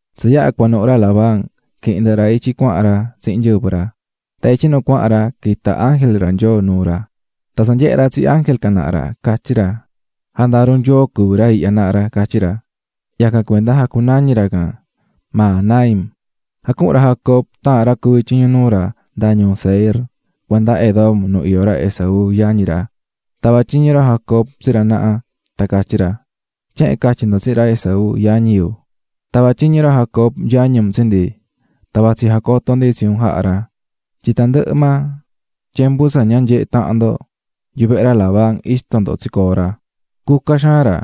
Tsa yaha̱ cuanuhu̱ ra Labán, quihi̱n ndɨhɨ ra Jacob ityi cuahan ra tsihin nyɨvɨ ra. Tan ityi nu cuahan ra quita̱ ángel Nyoo nuu ra. Tan tsa nyehe̱ ra tsi ángel can naha ra, catyí ra: "Jandaru Nyoo cuví ra ihya naha ra", catyí ra. Yacan cuenda jacunañi̱ ra can Mahanaim. Jacuhu̱n ra Jacob taahan ra cuví tyiñu nuu ra nda ñuu Seir cuenda Edom nu iyó ra Esaú, yañi ra. Tava̱ tyiñu ra Jacob tsi ra naha tan catyí ra: "Tyehen catyi ndo tsihin ra Esaú, yañi yu: 'Tava̱ tyiñu ra Jacob yañi un tsi ndi, tan vatsí jacoto ndi tsi un jaha̱ ra tyin tandɨhɨ maa tyembu tsa ña nyehe̱ tahan ndo, yuvehe ra Labán ixto ndo tsicoo̱ ra. Cuca xaan ra,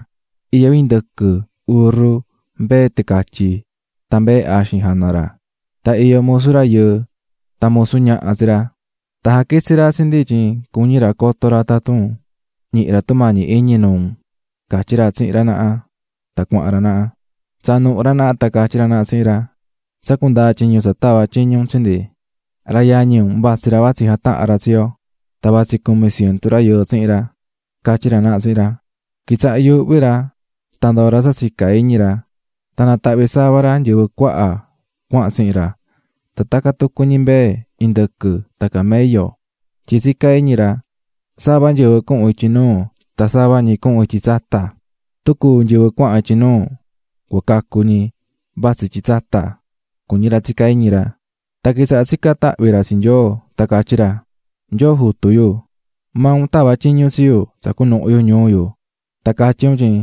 iyó indɨquɨ, urru, mbee ticatyi tan mbee axin jana ra, tan iyó musu rayɨɨ tan musu ñaha tsi ra, tan jaquitsi̱ ra tsi ndi tyin cuñí ra coto ra tun ñihi ra tumañi iñi nuu unꞌ", catyí ra tsihin ra naha tan cuahan ra naha. Tsaa̱ nuhu ra naha tan catyí ra naha tsihin ra: --Tsa cundaa̱ tyiñu tsa tava̱ un tsi ndi, ra yañi un vatsí ra vatsí jatahan ra tsi yo, tan vatsí cumi cientu rayɨɨ tsihin ra ―catyí ra naha tsihin ra. Quitsaha̱ yuuhví ra tan ndoo̱ ra tsa tsicá iñi ra. Tan natahvi̱ sava ra nyɨvɨ cuaha cuahan tsihin ra tan tacan tucu ñi mbee, indɨquɨ tan camello. Tyin tsicá iñi ra: "Sava nyɨvɨ cuhun ityi nuu tan sava ñi cuhun ityi tsata, tun cúu nyɨvɨ cuahan ityi nuu cua cacu ñi vatsí ityi tsata", cuñí ra tsicá iñi ra. Tan quitsahá tsicán tahvi ra tsi Nyoo tan catyí ra: "Nyoo jutu yu, maa un tava̱ tyiñu tsi yu tsa cunuhu yu ñuu yu tan catyí un tyin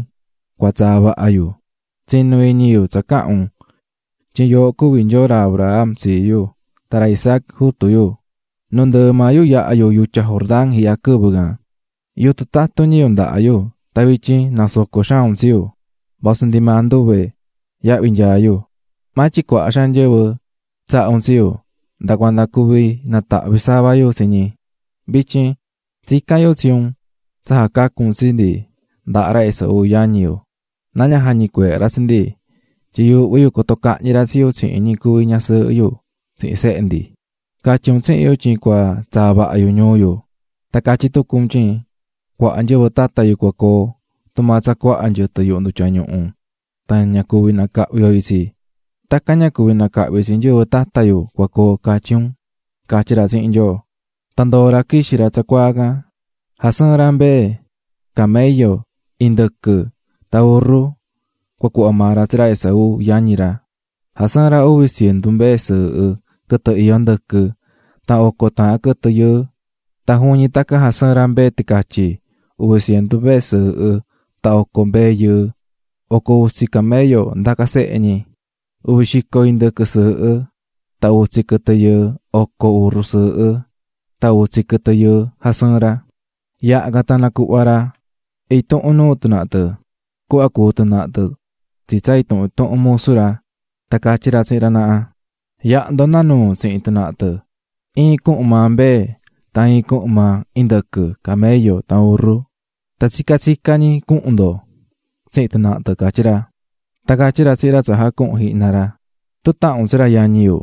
cua tsaa vaha yu, tsinu̱ iñi yu tsa caha̱n un tyin yooho cuví Nyoo ra Abraham tsii yu, tan ra Isaac jutu yu, nundɨɨ maa yu yaha̱ yu yutya Jordán ihya quɨvɨ can, yutun tatun ñi yu ndahá yu tan vityin nasoco̱ xaan un tsi yu vasu ndi maa nduve yahvi nyaa yu, maa tyin cuaha xaan nyɨvɨ tsaha̱ un tsi yu nda cuanda cuví natahvi̱ sava yu tsi ñi. Vityin tsicán yu tsi un tsa jacacu un tsi ndi ndaha ra Esau yañi yu, na ña jañicueehe ra tsi ndi, tyin yuuhví yu coto cahñi ra tsi yu tsihin ñi cuví ñasɨɨhɨ yu tsihin sehe ndi. Catyi̱ un tsihin yu tyin cua tsaa vaha yu ñuu yu tan catyí tucu un tyin cuaha nyɨvɨ tata yu cua coo, tumaa tsa cuaha nyɨtɨ yuhu ndutya ñuhu tan ña cuví nacahvi yo itsi tacan ña cuví nacahvi tsi nyɨvɨ tata yu cua coo, catyí un", catyí ra tsihin Nyoo. Tan ndoo̱ ra quixi̱ ra tsacuaa can. Jasɨɨ̱n ra mbee, camello, indɨquɨ tan urru cua cuhva maa ra tsi ra Esaú, yañi ra. Jasɨɨ̱n ra uvi cientu mbee sɨɨhɨ quɨtɨ iyó ndɨquɨ, tan oco taahan quɨtɨ yɨɨ, tan juvin ñi tacan jasɨɨ̱n ra mbee ticatyi, uvi cientu mbee sɨɨhɨ tan oco mbee yɨɨ. Oco utsi camello ndaca sehe ñi, uvi xico indɨquɨ sɨɨhɨ tan utsi quɨtɨ yɨɨ, oco urru sɨɨhɨ tan utsi quɨtɨ yɨɨ jasɨɨ̱n ra. Yaha can tan nacuhva̱ ra intuhun nuu tɨ naha tɨ cuhva cuú tɨ naha tɨ tsi tsa intuhun intuhun musu ra, tan catyí ra tsihin ra naha: --Ya̱ha ndo nda nuu tsihin tɨ naha tɨ, iin cuhun maa mbee tan iin cuhun maa indɨquɨ, camello tan urru, tan tsica tsica ñi cuhun ndo tsihin tɨ naha tɨ ―catyí ra. Tan catyí ra tsihin ra tsa jacuhu̱n jihna ra: --Tun tahan un tsi ra yañi yu,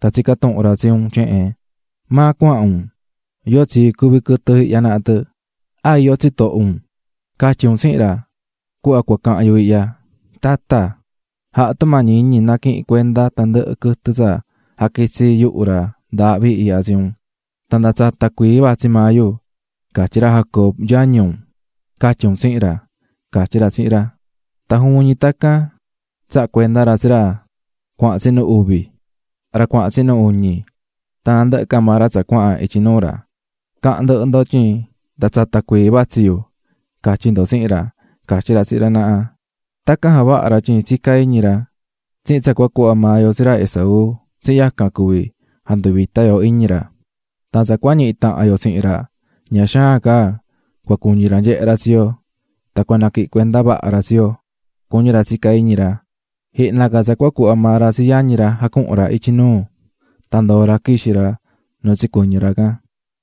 tan tsicá tuhun ra tsi un tyehen: ꞌ¿maa cuahan un? ¿yóo tsii cuví quɨtɨ ihya naha tɨ? ¿a iyó tsitoho un?ꞌ Ca̱tyi un tsihin ra cuhva cua cahan yu ihya: ꞌTata, ja̱ha tumañi iñi na̱quihin cuenda tandɨhɨ quɨtɨ tsa jaquitsí yuhu ra ndaahvi ihya tsi un, tan nda tsata cuii vatsí maa yu, catyí ra Jacob, yañi unꞌ, ca̱tyi un tsihin ra ―catyí ra tsihin ra. Tan juvin ñi tacan tsaha̱ cuenda ra tsi ra cuahan tsinu uvi, ra cuahan tsinu uñi tan nandɨhɨ ca maa ra tsa cuahan ityi nuu ra. ―Ca̱han ndɨhɨ ndo tyin nda tsata cuii vatsí yu, catyi ndo tsihin ra --catyí ra tsihin ra naha. Tacan javaha̱ ra tyin tsicá iñi ra: "Tsihin tsa cua cuhva maa yo tsi ra Esaú tsihin yacan cuvi janduvita yo iñi ra, tan tsa cua ñihi tahan yo tsihin ra ña xaan ca cua cuñi ra nyehe ra tsi yo tan cua naquihin cuenda vaha ra tsi yo", cuñí ra tsicá iñi ra. Jihna ca tsa cua cuhva maa ra tsi yañi ra jacuhu̱n ra ityi nuu, tan ndoo̱ ra quixi̱ ra nu tsicuɨñɨ̱ ra can.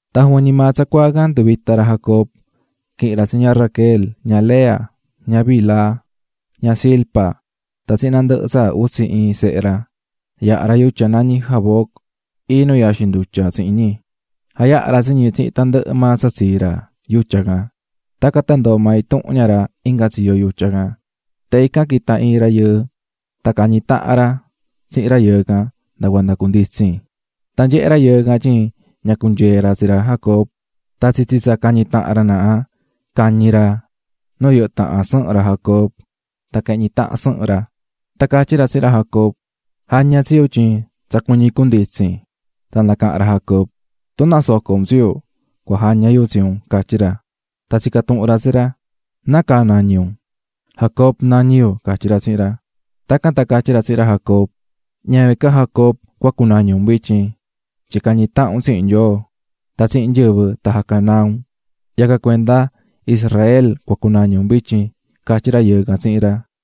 Tan juvin ñi maa tsacuaa can nduvita̱ ra Jacob, quihi̱n ra tsi ña Raquel, ña Lea, ña Bilha, ña Zilpa, tan tsihin nandɨhɨ tsa utsi iin sehe ra, yaha̱ ra yutya nañí Jaboc, iin nu yaxin ndutya tsihin ñi. Jayaha̱ ra tsi ñi tsihin tandɨhɨ maa tsa tsii ra yutya can. Tacan tan ndoo̱ maa intuhun ña ra inga tsiyo yutya can, tan ican quita̱ iin rayɨɨ, tan cañi̱ tahan ra tsihin rayɨɨ can nda cuanda cunditsin. Tan nyehé rayɨɨ can tyin ña cunyeé ra tsi ra Jacob, tan tsitsi tsa cañí tahan ra naha, cañi̱ ra nu yɨhɨ́ tahan sɨhɨn ra Jacob tan quehñi̱ tahan sɨhɨn ra. Tan catyí ra tsihin ra Jacob: --Ja̱ña tsi yu tyin tsa cuñí cunditsin. Tan nacaha̱n ra Jacob: --Tun nasoco un tsi yu, cua jaña yu tsi un ―catyí ra. Tan tsica̱ tuhun ra tsi ra: ―¿Nácaa nañí un? --Jacob, nañí yu --catyí ra tsihin ra. Tacan tan catyí ra tsihin ra Jacob: --Ñavin ca Jacob cua cunañi un vityin, tyin cañi̱ tahan un tsihin Nyoo, tan tsihin nyɨvɨ tan jacanaa̱ un, yacan cuenda Israel cua cunañi un vityin ―catyí rayɨɨ can tsihin ra.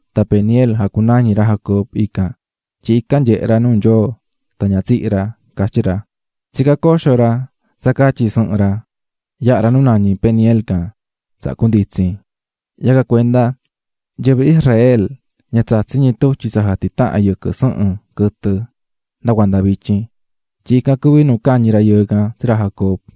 Tan Peniel jacunañi̱ ra Jacob ican, tyin ican nyehe̱ ra nuu Nyoo tan ña tsihi̱ ra, catyí ra. Tsicá coxo ra tsa catyi sɨhɨn ra, yaha̱ ra nu nañí Peniel can, tsaha cunditsi̱n. Yacan cuenda, nyɨvɨ Israel ña tsatsí ñi tutyi tsa jatitahan yɨquɨ sɨhɨn quɨtɨ nda cuanda vityin, tyin ican cuví nu cañi̱ rayɨɨ can tsi ra Jacob.